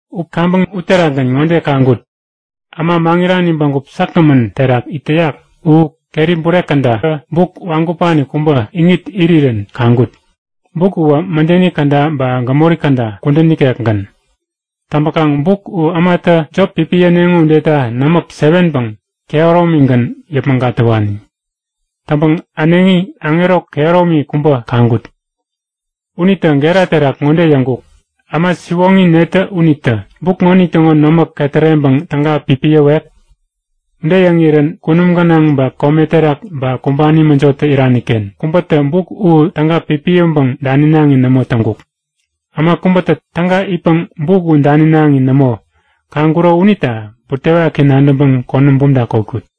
U kaŋpäŋ uterakgän ŋode kaŋkut; Äma maŋirani bägup säkgämän terak it täyak u keri bure kädatä buk wagupani kubä iŋit irirän kaŋkut. Buk uwä mädeni käda ba gämori käda kudän ikekgän. Täŋpäkaŋ buk u ämatä jop pipiyäneŋo udeta nämäk 7päŋ kehäromigän yäpmäŋ gatäwani. Täŋpäŋ äneŋi aŋero kehäromi kubä kaŋkut. Unitä gera terak ŋode yäŋkuk; Äma siwoŋi netä unitä buk ŋonitäŋo nämäk ketäreŋpäŋ täga pipiyäwek? Ude yäŋirän kunum gänaŋ ba kome terak ba kumbani mäjotä irani-ken kubätä buk u täga pipiyäŋpäŋ daninaŋi nämo täŋkuk. Äma kubätä täga itpäŋ buk u daninaŋi nämo kaŋkuro unita butewaki nadäŋpäŋ konäm bumta kotkut.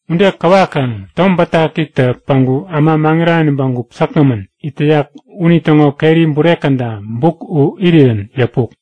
Ude kawakaŋ Tom Bätakitä päŋku äma maŋirani bägup säkgämän it täyak unitäŋo keri bure käda buk u irirän yäpuk.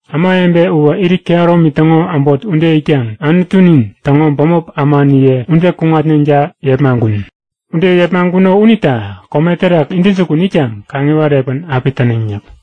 Ämawebe uwä irit kehäromi täŋo äbot ude itkaŋ Anutunin täŋo bämop ämaniye ude kuŋatneŋta yepmaŋkun. Ude yepmaŋkuno unita kome terak intäjukun itkaŋ kaŋiwat epän api täneŋ yäk.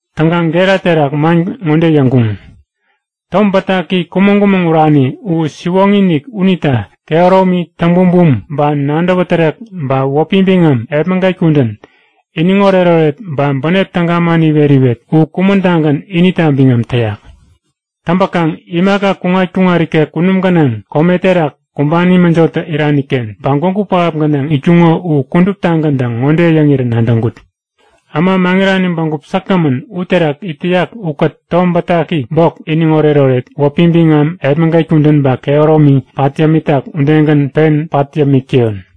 Täŋkaŋ gera terak man ŋode yäŋkuŋ; Tom Bätaki kumäŋ-kumäŋ urani u siwoŋi-inik unita kehäromi, täŋbumbum ba nadäwä tärek ba wäpi biŋam, epmäget kudän, iniŋoret-oret, ba bänep täga man iwet-iwet u kumän-tagän inita biŋam täyak! Täŋpäkaŋ imaka kuŋat-kuŋat ikek kunum gänaŋ, kome terak, kumbani mäjotä irani-ken ba gwägu pähap gänaŋ itkuŋo u kuduptagäntä ŋode yäŋirä nadäŋkut; Äma maŋirani bägup säkgämän uterak it täyak ukät Tom Bätaki bok, iniŋoret-oret, wäpi biŋam, epmäget kudän ba kehäromi pat yämitak udegän pen pat yämik täyon!